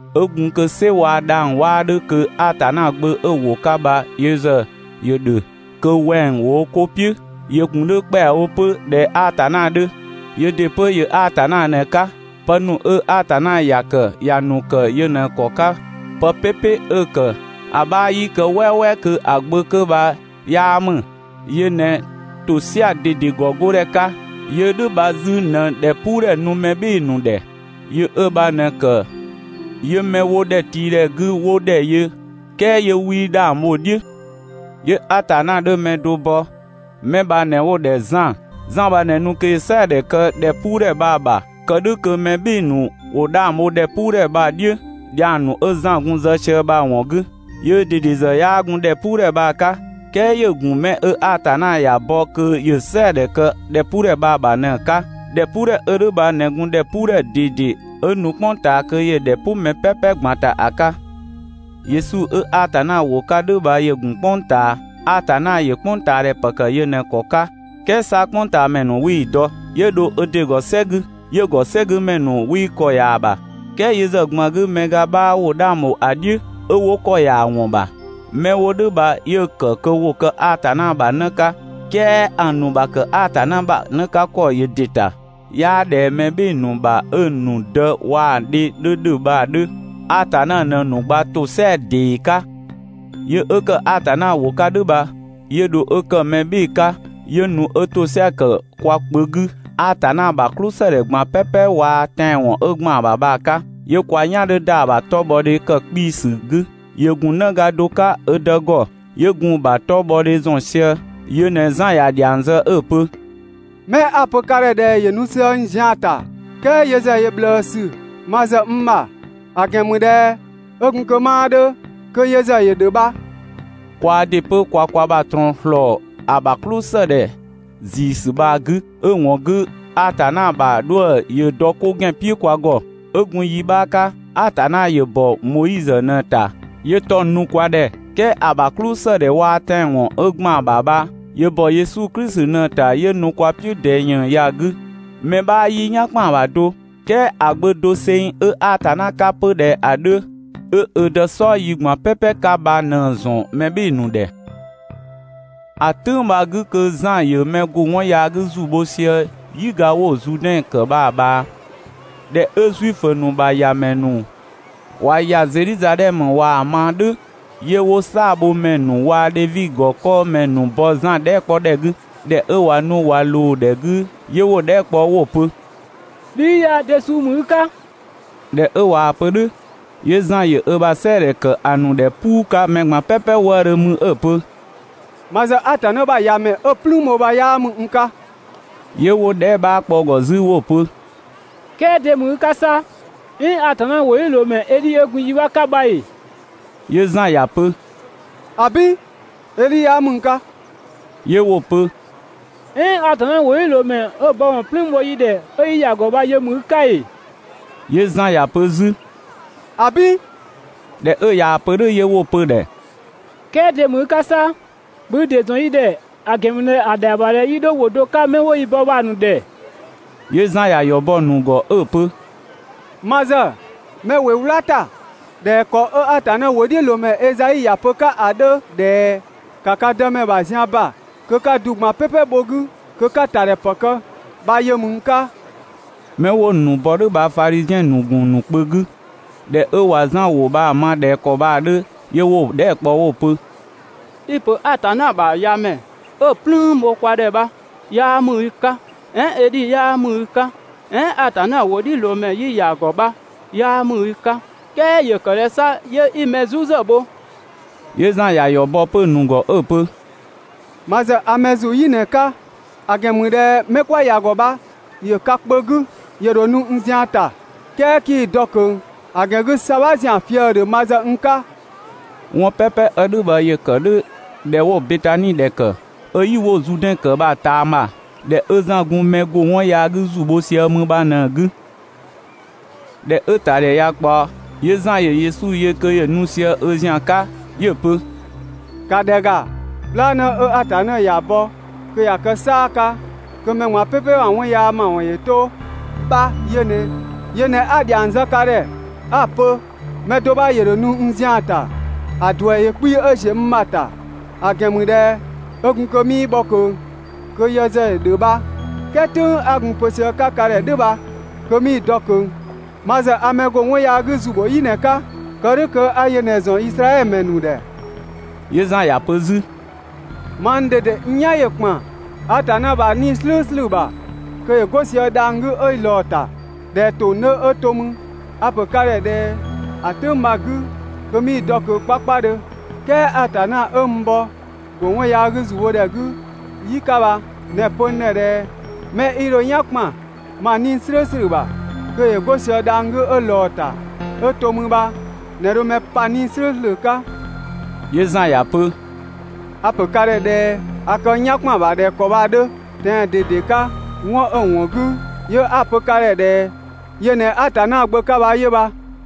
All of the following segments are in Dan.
'Ö gun kö "sɛ waa‑ dhang‑ 'waa 'dhö kö (Atanna Gbö) 'ö‑ ‑Wʋ 'ka bha yö ‑zë ‑yö ‑dhö kö wɛng‑ ‑wo wo 'ko "piʋ̈. ‑Yö ‑gun 'dhö ‑kpɛawo 'pö (꞊dhɛ Atanna 'dhö), yöö ‑dɩ 'pö ‑yö Atanna ꞊në‑ 'ka. Pë ‑nu 'ö Atanna ‑ya ‑kë, ‑ya ‑nu ‑kë yö ꞊në‑ ‑kɔ 'ka. Pë "pɛpɛ 'ö‑ ‑kë, ‑a 'bha 'yii kë "wɛɛwɛɛ kö ‑a Gbö 'kö bha 'yaa ‑mü. Yö ꞊në ‑tosɛa ꞊dede ‑gɔgodhɛ 'ka. Yö 'ö "dhʋ̈ bha 'zü ꞊në ‑dhɛpuudhɛ nu mɛ "bhɩɩ‑ ‑nu ‑dhɛ. Yö 'ö bha ꞊në‑ ‑kë 'yö 'mɛ 'wo ‑dhɛtiidhɛ 'gü 'wo ‑dhɛ yö, "kɛɛ 'yö 'wii 'dhang bho‑ "dhiʋ̈. 'Yö Atanna 'dhö mɛ do bɔ, 'mɛ bha ꞊në 'wo‑ ‑dhɛ Zan. Zan bha ꞊në nu kö ‑yö "sɛɛdhɛ kë ‑dhɛpuudhɛ bha‑ ‑bha. Kë "dhʋ̈ kö mɛ "bhɩɩ‑ ‑nu ‑wo 'dhang bho ‑dhɛpuudhɛ bha‑ "dhiʋ̈ dhiang ‑nu 'ö Zan gun‑ zë sië bha‑ ‑wɔn 'gü. Yöö ꞊dede ‑zë 'yaa gun ‑dhɛpuudhɛ bha‑ 'ka, "kɛɛ ‑yö ‑gun 'mɛ 'ö Atanna ‑ya bɔ kö ‑yö "sɛɛdhɛ kë ‑dhɛpuudhɛ bha‑ ‑bha ꞊në‑ 'ka. ‑Dhɛpuudhɛ 'ö "dhʋ̈ bha ꞊në gun ‑dhɛpuudhɛ ꞊dede, 'ö nu "kpʋng ꞊taa kö ‑yö ‑dhɛ "pʋ mɛ "pɛpɛ ꞊gban ‑ta ‑a 'ka. Yesu 'ö Atanna ‑wʋ 'ka "dhʋ̈ bha ‑yö ‑gun "kpʋng ꞊taa. Atanna ‑yö "kpʋngtaadhɛ ‑pë ‑kë yö ꞊në‑ ‑kɔ 'ka, "kɛɛ 'sa "kpʋngtaamɛ ‑nu 'wii‑ dɔ. 'Yö dho ö ‑dɩ ‑gɔ "sɛ 'gü, 'yö‑ ‑gɔ "sɛ 'gü ‑mɛ ‑nu 'wii ‑kɔ ‑ya ‑bha. "Kɛɛ yö ‑zë ꞊gban 'gü, mɛ ga 'bha ‑wo 'dhang ‑bho ‑a "dhiʋ̈, 'ö 'wo ‑kɔ ‑ya ‑wɔn ‑bha. 'Mɛ 'wo "dhʋ̈ bha 'yö‑ ‑kë kö ‑wo kë Atanna ‑bha 'në 'ka. "Kɛɛ ‑a ‑nu ‑bha ‑kë Atanna ‑bha 'në 'ka ‑kɔ ‑yö ‑dɩ ‑ta, 'yaa ꞊dhɛ mɛ "bhɩɩ‑ ‑nu ‑bha 'ö‑ ‑nu dë (waa‑ dhe) 'dhö ‑dhö bha‑ 'dhö; Atanna ꞊në‑ ‑nu gba ‑tosɛa ‑dee 'ka. Yö 'ö ‑kë Atanna ‑wʋ 'ka "dhʋ̈ bha, 'yö dho 'ö ‑kë mɛ "bhɩɩ‑ 'ka, 'yö nu 'ö ‑tosɛa ‑kë kwa kpö 'gü, Atanna ‑bha "klʋsëdhɛ ꞊gban "pɛpɛ waa‑ tɛanwɔn 'ö ‑gban ‑bha bha‑ 'ka, 'yö kwa "yan 'dhö ‑da ‑a ‑bha 'tɔbhɔdhe kë 'kpiisü 'gü. ‑Yö ‑gun 'në ga do 'ka ö Dë ‑gɔ, 'yö gun‑ ‑bha 'tɔbhɔdhe ‑zɔn sië. Yö ꞊në Zan ‑ya ‑dhiang zë 'ö‑ pö: «'Mɛ 'a‑ pö ka ‑dhɛ ꞊dhɛ ‑yö nu sië n zian‑ ‑ta, "kɛɛ yö ‑zë ‑yö ꞊bhlëësü ma ‑zë n ‑bha, ‑a ‑gɛn ‑mü ꞊dhɛ 'ö gun kö 'maa 'dhö kö yö ‑zë ‑yö ‑dhö bha.» Kwaa ‑dɩ 'pö kwa kwa ‑bha ꞊trɔɔn ‑slɔɔ ‑a ‑bha "klʋsëdhɛ ‑ziisü bha‑ 'gü, 'ö‑ ‑wɔn 'gü Atanna ‑bha 'dhuë‑ ‑yö dɔ 'ko ‑gɛn "piʋ̈ kwa ‑gɔ. 'Ö gun yi 'bha 'ka, Atanna ‑yö bɔ Moizö ꞊në‑ ‑ta 'yö 'tɔng‑ nu kwa ‑dhɛ. "Kɛɛ ‑a ‑bha "klʋsëdhɛ waa‑ tɛanwɔn 'ö ‑gban ‑bha bha, ‑yö ‑bɔ Yesu Klisi ꞊në‑ ‑ta 'yö nu kwa "piʋ̈ ꞊dɛɛ ‑yën ya‑ 'gü. Mɛ 'bha 'yii "yan ‑kpan ‑bha do, "kɛɛ ‑a Gbö doseng 'ö Atanna 'ka ('pö ꞊dhɛ ‑a 'dhö), 'ö ö Dë "sɔɔ yi ꞊gban "pɛpɛ 'ka bha ꞊në‑ ‑zɔn mɛ "bhɩɩ‑ ‑nu ‑dhɛ. (‑A "tʋ̈ng bha‑ 'gü kö Zan ‑yö mɛ ‑go 'wɔn yaa 'gü ‑zu bho sië "yiga 'wo‑ Zuudɛn ‑kë bha‑ ꞊bhaa.) ꞊Dhɛ 'ö Zuifö ‑nu ‑bha ‑yamɛ ‑nu ꞊wa ‑ya Zedhizadhɛmö ꞊waa‑ ma "dhʋ̈, 'yö 'wo "saabhomɛ ‑nu waa‑ Dhevi ‑gɔ 'kɔɔmɛ ‑nu bɔ Zan dhɛɛ" 'kpɔ ‑dhɛ 'gü. ꞊Dhɛ 'ö ꞊wa nu ꞊wa ꞊loo‑ ‑dhɛ 'gü, 'yö 'wo‑ dhɛɛ" kpɔ 'wo‑ pö: «Bhi 'i ya de suu ‑mü i 'ka?» ꞊Dhɛ 'ö ꞊waa‑ pö "dhʋ̈, 'yö Zan ‑yö ö ‑bha "sɛɛdhɛ ‑kë ‑a ‑nu ‑dhɛ "puu 'ka mɛ ꞊gban "pɛpɛ wëëdhö mü 'ö‑ pö: «Ma ‑zë Atanna ‑bha ‑Yamɛ ('ö‑ "plüün bho bha) 'yaa ‑mü n 'ka.» 'Yö 'wo‑ dhɛɛ" 'bha kpɔ 'zü 'wo‑ pö: «"Kɛɛ de ‑mü i 'ka 'sa? "Ɛɛn (Atanna ‑wʋdhiʋ̈loomɛ) Edhi ('ö gun yi 'bha 'ka bha) ‑ee?» 'Yö Zan ‑ya pö: «‑Abin! Edhi 'yaa ‑mü n 'ka!» 'Yö 'wo‑ pö: «"Ɛɛn Atanna ‑wʋdhiʋ̈loomɛ 'ö‑ bɔ ‑wɔn "plüün bho yi ‑dhɛ 'ö 'yi ‑ya ‑gɔ bha yö ‑mü i 'ka ‑ee?» 'Yö Zan ‑ya pö 'zü: «‑Abin.» ꞊Dhɛ 'ö ꞊yaa‑ pö "dhʋ̈, 'yö 'wo‑ pö‑ ‑dhɛ: "Kɛɛ de ‑mü i 'ka 'sa? ‑Bhö i ‑dɩ ‑zɔn yi ‑dhɛ, ‑a ‑gɛn ‑mü ꞊dhɛ ‑a ‑dhɛa ‑bha ꞊dhɛ 'yi 'dho ‑wʋ do 'ka 'mɛ 'wo yi bɔ bha‑ ‑nu ‑dhɛ.» 'Yö Zan ‑ya ‑yɔ bɔ‑ ‑nu ‑gɔ 'ö‑ pö: «Ma ‑zë 'mɛ 'ö ‑wɩ "wla ‑ta ꞊dhɛ ‑kɔ 'ö Atanna ‑wʋdhiʋ̈loomɛ Ezai ‑ya pö‑ 'ka ‑a 'dhö ꞊dhɛ: ‹‑Ka ka Dëmɛ ‑bha zian ‑ba kö 'ka‑ du ꞊gban "pɛpɛ bho‑ 'gü, kö 'ka‑ ‑ta ‑dhɛ ‑pë kë› bha yö ‑mü n 'ka.» 'Mɛ 'wo‑ ‑nu bɔ "dhʋ̈ bha Fadhiziɛn ‑nu ‑gun ‑nu kpö 'gü. ꞊Dhɛ 'ö ꞊wa Zan ‑wʋ ma ꞊dhɛ ‑kɔ bha‑ 'dhö, 'yö 'wo‑ dhɛɛ" kpɔ 'pö 'wo‑ pö: «I‑ ‑pö Atanna ‑bha ‑Yamɛ 'ö‑ "plüün bho kwa ‑dhɛ bha 'yaa ‑mü i 'ka, "ɛɛn Edhi 'yaa ‑mü i 'ka, "ɛɛn Atanna ‑wʋdhiʋ̈loomɛ 'yi ‑ya ‑gɔ bha 'yaa ‑mü i 'ka, "kɛɛ ‑yö ‑kë ꞊dhɛ 'sa 'yö 'i "zu ‑zë bho?» 'Yö Zan ‑ya ‑yɔ bɔ 'pö‑ ‑nu ‑gɔ 'ö‑ pö: «Ma ‑zë a mɛ ‑zu "yi ꞊në‑ 'ka, ‑a ‑gɛn ‑mü ꞊dhɛ 'mɛ ('kwa ‑ya ‑gɔ bha ‑yö ka kpö 'gü), ‑yö ‑dho nu n zian‑ ‑ta, "kɛɛ 'kii‑ dɔ ꞊kö. ‑A ‑gɛn 'gü ‑sabha ‑zian fië‑ ‑dhö ma ‑zë n 'ka. 'Wɔn "pɛpɛ 'ö "dhʋ̈ bha ‑yö ‑kë "dhʋ̈ ‑dhɛ 'wo‑ Betani ‑dhɛ ‑kë, 'ö "yi 'wo‑ Zuudɛn ‑kë bha‑ ꞊taama, ‑dhɛ 'ö Zan gun mɛ ‑go 'wɔn yaa 'gü ‑zu bho sië mü bha ꞊në‑ 'gü. ꞊Dhɛ 'ö‑ ‑ta ‑dhɛ ꞊ya ꞊kpaɔ, 'yö Zan ‑yö Yesu yö kö ‑yö nu sië ö ‑zian 'ka. 'Yö‑ pö: «‑Ka ‑dhɛ ‑ga, "bhlaanë 'ö Atanna ‑ya bɔ kö ‑ya kë "saa‑ 'ka kö mɛ ꞊gban "pɛpɛ ‑bha 'wɔn yaa ‑mawɔn ‑yö 'to bha yö ꞊nɛ! Yö ꞊në 'a‑ ‑dhiang zë ka ‑dhɛ 'a‑ pö: «Mɛ do 'bha ‑yö ‑dho nu n zian‑ ‑ta, ‑a ‑duɛ ‑yö 'kpii‑ 'ö ‑ziö n ‑ma ‑ta, ‑a ‑gɛn ‑mü ꞊dhɛ 'ö gun kö 'mii bhɔ ꞊kö kö yö ‑zë ‑yö ‑dhö bha. "Kɛɛ "tʋ̈ng 'a gun‑ pö sië‑ 'ka ka ‑dhɛ "dhʋ̈ bha kö 'mii‑ dɔ ꞊kö. Ma ‑zë a mɛ ‑go 'wɔn yaa 'gü ‑zu bho "yi ꞊në‑ 'ka, kë "dhʋ̈ kö 'a yö ꞊në‑ ‑zɔn Izraɛdhö ‑mɛ ‑nu ‑dhɛ.» 'Yö Zan ‑ya pö 'zü: «Mang ꞊dede n "yan ‑yö ‑kpan Atanna ‑bha 'Nii‑ "slʋ̈ʋ̈slʋ̈ ‑bha kö ‑yö 'go sië dhang‑ 'gü 'ö ꞊lɔɔ‑ ‑ta ꞊dhɛ ‑tong 'dhö 'ö to 'mü. A‑ ‑pö ka ‑dhɛ ꞊dhɛ ‑a "tʋ̈ng bha‑ 'gü kö 'mii‑ dɔ ꞊kö 'kpakpadhö. "Kɛɛ Atanna 'ö n bɔ ‑go 'wɔn yaa 'gü ‑zu bho ‑dhɛ 'gü "yi 'ka bha ꞊në‑ pö n ‑dhɛ ꞊dhɛ: «'Mɛ 'i dho i "yan ‑kpan ma 'Nii‑ "slʋ̈ʋ̈slʋ̈ ‑bha kö ‑yö 'go sië dhang‑ 'gü 'ö ꞊lɔɔ‑ ‑ta 'ö to 'mü bha ꞊në dho mɛ pa 'Nii‑ "slʋ̈ʋ̈slʋ̈ 'ka.». 'Yö Zan ‑ya pö: «A‑ ‑pö ka ‑dhɛ ꞊dhɛ a kë n "yan ‑kpan ‑bha ꞊dhɛ ‑kɔ bha‑ 'dhö tɛan‑ 'ka. 'Wɔn 'ö‑ ‑wɔn 'gü 'yö 'a‑ pö ka ‑dhɛ ꞊dhɛ yö ꞊në Atanna Gbö 'ka bha 'yö bha.»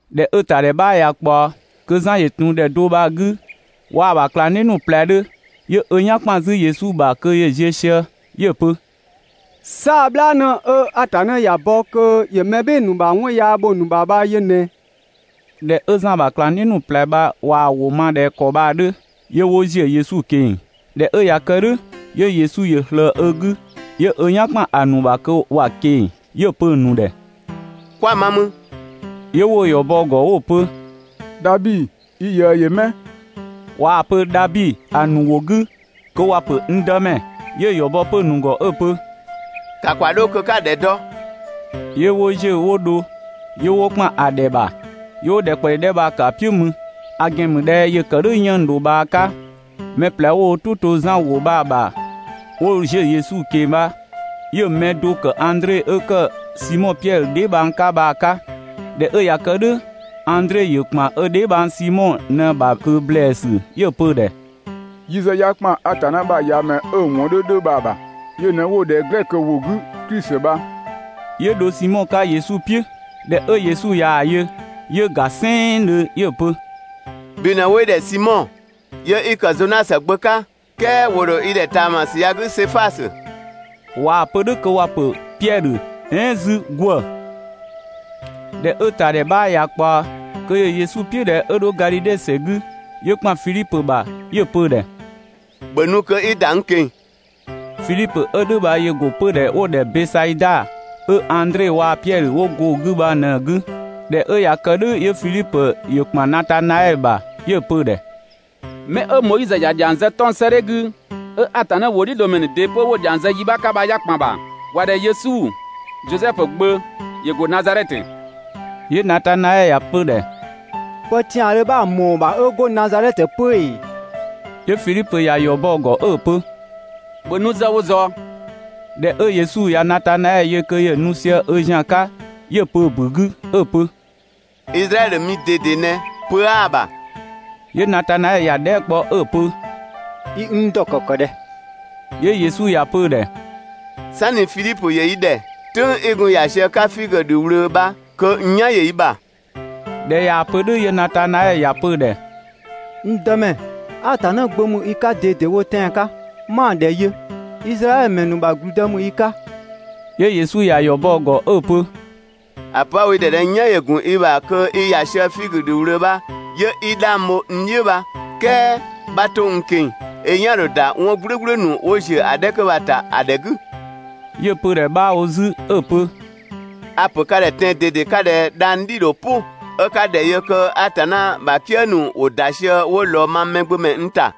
꞊Dhɛ 'ö‑ ‑tadhɛ 'bha ꞊ya ꞊kpaɔ, kö Zan ‑yö ‑tun ‑dhɛ do bha‑ 'gü waa‑ ‑bha ꞊klangdhiʋ̈ ‑nu ꞊plɛ 'dhö, 'yö ö "yan ‑kpan 'zü Yesu ‑bha kö ‑yö ziö sië. 'Yö‑ pö: «"Saa‑ "bhlaanë 'ö Atanna ‑ya bɔ (kö ‑yö mɛ "bhɩɩ‑ ‑nu ‑bha 'wɔn yaa bho‑ ‑nu ‑bha) bha yö ꞊nɛ!» ꞊Dhɛ 'ö Zan ‑bha ꞊klangdhiʋ̈ ‑nu ꞊plɛ bha ꞊waa‑ ‑wʋ ma ꞊dhɛ ‑kɔ bha‑ 'dhö, 'yö 'wo ‑ziö Yesu ꞊keng‑. ꞊Dhɛ 'ö ꞊ya ‑kë "dhʋ̈, 'yö Yesu ‑yö ꞊slëë ö 'gü, 'yö "yan ‑kpan ‑a ‑nu ‑bha kö ‑wa ꞊keng‑, 'yö‑ pö‑ ‑nu ‑dhɛ: «Kwa‑ ma 'mü?» 'Yö 'wo‑ ‑yɔ bɔ‑ ‑gɔ 'wo‑ pö: «Dhabi, i ꞊yëë ‑yö 'mɛ?» (꞊Waa‑ pö «Dhabi» ‑a ‑nu ‑wʋ 'gü kö ‑wa pö «n Dëmɛ».) 'Yö‑ ‑yɔ bɔ 'pö‑ ‑nu ‑gɔ 'ö‑ pö: «‑Ka ‑kwa 'dho kö 'ka‑ ‑dhɛ dɔ!» 'Yö 'wo ‑ziö 'wo dho. 'Yö 'wo ‑kpan ‑a ‑dhɛ ‑bha, 'yö 'wo ‑dhɛ ꞊kpaɔ ‑yi 'dhɛ bha‑ ‑kë ‑a "piʋ̈ mü. (‑a ‑gɛn ‑mü ꞊dhɛ ‑yö ‑kë "dhʋ̈ 'yënng‑ ‑dho bhaa 'ka). Mɛ ꞊plɛ 'wo "tʋ to Zan ‑wʋ bha‑ ‑bha 'wo ‑ziö Yesu ꞊keng‑ bha, 'yö‑ mɛ do‑ ‑kë Andre 'ö ‑kë Simɔ Piɛdhö dheebhang 'ka bha‑ 'ka. ꞊Dhɛ 'ö ꞊ya kë "dhʋ̈, Andre ‑yö ‑kpan ö dheebhang Simɔ ꞊në‑ ‑bha ꞊kö ‑blɛɛsü 'yö‑ pö‑ ‑dhɛ: «Yi ‑zë 'ya ‑kpan Atanna ‑bha ‑Yamɛ 'ö‑ ‑wɔn 'dhö 'dhö bha‑ ‑bha!» (Yö ꞊në 'wo‑ ‑dhɛ glɛkö ‑wʋ 'gü Klisi bha.) 'Yö dho Simɔ 'ka Yesu "piʋ̈. ꞊Dhɛ 'ö Yesu ꞊yaa‑ yö, 'yö‑ ‑ga "sɛnngdhö 'yö‑ pö: «Bhi ꞊në 'wo i ‑dhɛ Simɔ, 'yö 'i ‑kë Zonasö gbö 'ka, "kɛɛ ‑wo ‑dho i ‑dhɛ ꞊taamasü ya‑ 'gü Sefasö (꞊waa‑ pö "dhʋ̈ kö ‑wa ‑pö Piɛdhö, "ɛɛn 'zü ‑gwë). ꞊Dhɛ 'ö‑ ‑ta ‑dhɛ 'bha ꞊ya ꞊kpaɔ, kö ‑yö Yesu "piʋ̈ ꞊dhɛ 'ö 'dho Gadhidhe ‑sɛ 'gü, 'yö ‑kpan Fidhipö ‑bha, 'yö‑ pö‑ ‑dhɛ: «‑Bhö nu kö 'i ‑da n ꞊keng‑!» Fidhipö 'ö "dhʋ̈ bha ‑yö ‑go 'pödhɛ 'wo‑ ‑dhɛ Bɛsaida 'ö Andre waa‑ Piɛdhö 'wo go‑ 'gü bha ꞊në‑ 'gü. ꞊Dhɛ 'ö ꞊ya kë "dhʋ̈, 'yö Fidhipö ‑yö ‑kpan Natanaɛɛ ‑bha 'yö‑ pö‑ ‑dhɛ: «'Mɛ 'ö Moizö ‑ya ‑dhiang zë 'tɔng‑ 'sëëdhɛ 'gü, 'ö Atanna ‑wʋdhiʋ̈loomɛ ‑nu ‑dɩ 'pö 'wo‑ ‑dhiang zë yi 'bha 'ka bha 'ya ‑kpan ‑bha. ‑Wa ‑dhɛ Yesu, Zosɛfu gbö, ‑yö ‑go Nazadhɛtö.» 'Yö Natanaɛɛ ‑ya pö‑ ‑dhɛ: «Pë ‑tiandhö 'bha‑ ‑mɔɔ ‑bha 'ö go Nazadhɛtö 'pö ‑ee?» 'Yö Fidhipö ‑ya ‑yɔ bɔ‑ ‑gɔ 'ö‑ pö: «‑Bhö nu ‑zë wo ꞊zɔɔ!» ꞊Dhɛ 'ö Yesu ꞊ya Natanaɛɛ yö kö ‑yö nu sië ö ‑zian 'ka, 'yö‑ pö‑ ‑bu 'gü 'ö‑ pö: «Izraɛdhö mi ꞊dede ꞊nɛ, pö 'aa‑ ‑bha!» 'Yö Natanaɛɛ ‑ya dhɛɛ" kpɔ 'ö‑ pö: «I n dɔ ‑kɔ ‑kë ꞊dhɛ?» 'Yö Yesu ‑ya pö‑ ‑dhɛ: «"Sanni Fidhipö ‑yö i ‑dhɛ, "tʋ̈ng 'i gun ‑ya sië‑ 'ka figö ‑dhü ꞊wlöö bha kö n "yan ‑yö i ‑bha.» ꞊Dhɛ ꞊yaa‑ pö "dhʋ̈, 'yö Natanaɛɛ ‑ya pö‑ ‑dhɛ: «N Dëmɛ, Atanna Gbö ‑mü i 'ka ꞊dedewo tɛan‑ 'ka, 'ma‑ ‑dhɛ yö, Izraɛdhö ‑mɛ ‑nu ‑bha ‑gblüdë ‑mü i 'ka!» 'Yö Yesu ‑ya ‑yɔ bɔ‑ ‑gɔ 'ö‑ pö: «‑A pö 'a‑ wo i ‑dhɛ ꞊dhɛ n "yan ‑yö ‑gun i ‑bha kö i ‑ya sië figö ‑dhü ꞊wlöö bha 'yö 'i 'dhang bho n "dhiʋ̈ bha "kɛɛ ('bha 'to n ꞊keng‑), i "yan‑ ‑dho ‑da 'wɔn "gblʋ̈gblʋ̈ ‑nu 'wo ‑ziö ‑a 'dhɛ 'kö bha‑ ‑ta ‑a ‑dhɛ 'gü!» 'Yö‑ pö‑ ‑dhɛ 'bha wo 'zü 'ö‑ pö: «A‑ ‑pö ka ‑dhɛ tɛan‑ ꞊dede 'ka ꞊dhɛ dhang‑ "dhi‑ ‑dho "pʋ 'ö 'ka‑ ‑dhɛ yö kö Atanna ‑bha "kië ‑nu ‑wo ‑da sië 'wo ꞊lɔɔ mang Mɛgbömɛ n ‑ta.»